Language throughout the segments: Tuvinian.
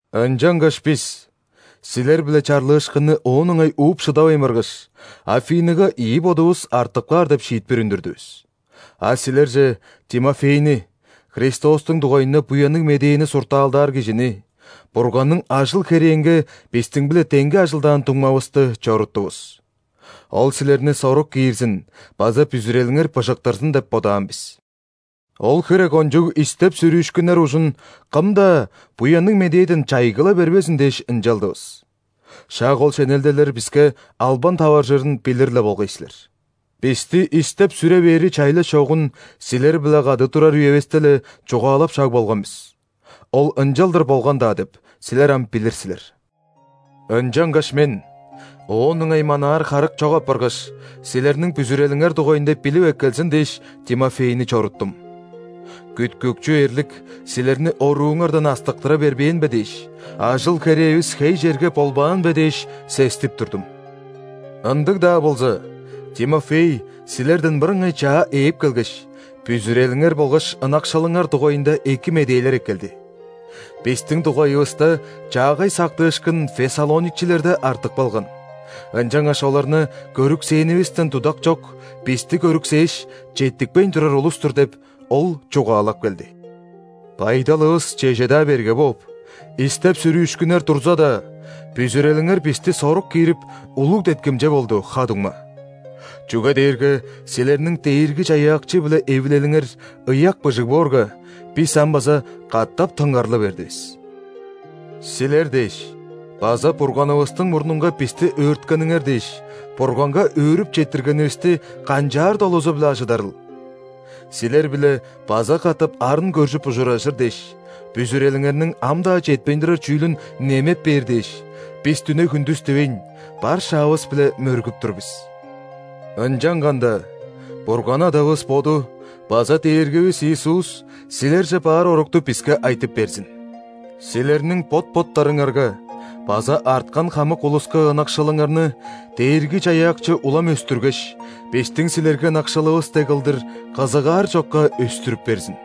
Ынчангаш бис, силер-биле чарлыышкынны оон ыңай ууп шыдавайн баргаш, Афиныга ийи бодувус артып каар деп шиитпир үндүрдүвүс. А силерже Тимофейни, Христостуң дугайында Буянныг Медээни суртаалдаар кижини, Бурганның ажыл-херээнге бистиң-биле деңге ажылдаан дуңмавысты, чоруттувус. Ол силерни сорук киирзин база бүзүрелиңер быжыктырзын деп бодаан бис. Ол хире кончуг истеп-сүрүүшкүннер ужун кым-даа Буянныг Медээден чайгыла бербезин дээш ынчалдывыс. Шак ол шенелделер биске албан таваржырын билир-ле болгай силер. Бисти истеп-сүре бээри чайлаш чогун силер-биле кады турар үевисте-ле чугаалап шаг болган бис. Ол ынчалдыр болган-даа деп, силер ам билир силер. Ынчангаш мен, оон ыңай манаар харык чок апаргаш, силерниң бүзүрелиңер дугайында билип эккелзин дээш, Тимофейни чоруттум. Күткүкчү эрлик силерни орууңардан астыктыра бербээн бе дээш, ажыл-херээвис хей черге болбаан бе дээш, сестип турдум. Ындыг-даа болза, Тимофей силерден мырыңай чаа ээп келгеш, бүзүрелиңер болгаш ынакшылыңар дугайында эки медээлер эккелди. «Бистиң дугайывыста чаагай сактыышкын фессалоникчилерде артып калган, ынчангаш оларны көрүксээнивистен дудак чок, бисти көрүксээш, четтикпейн турар улус-тур» – деп, ол чугаалап келди. Байдалывыс чеже-даа берге бооп, истеп-сүрүүшкүннер турза-даа, бүзүрелиңер бисти сорук киирип, улуг деткимче болду, ха-дуңма. Чүге дээрге силерниң Дээрги-Чаяакчы-биле эвилелиңер ыяк быжыг боорга, бис ам база катап тынгарлы бердивис. Силер дээш база Бурганывыстың мурнунга бисти өөрткениңер дээш, Бурганга өөрүп четтиргенивисти канчаар долузу-биле ажыдарыл?! Силер-биле база катап арын көржүп ужуражыр дээш, бүзүрелиңерниң ам-даа четпейн турар чүүлүн немеп бээр дээш, бис дүне-хүндүс дивейн, бар шаавыс-биле мөргүп тур бис. Ынчанганда Бурган Адавыс Боду база Дээргивис Иисус силерже баар орукту биске айтып берзин. Силерниң бот-боттарыңарга база арткан хамык улуска ынакшылыңарны Дээрги-Чаяакчы улам өстүргеш, бистиң силерге ынакшылывыс дег кылдыр, кызыгаар чокка өстүрүп берзин.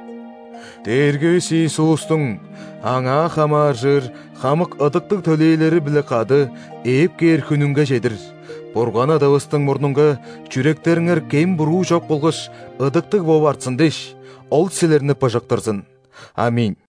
Дээргивис Иисустуң Аңаа хамааржыр хамык ыдыктыг төлээлери-биле кады ээп кээр хүнүнге чедир Бурган Адавыстың мурнунга чүректериңер кем-буруу чок болгаш ыдыктыг бооп артсын дээш, Ол силерни быжыктырзын. ·Аминь.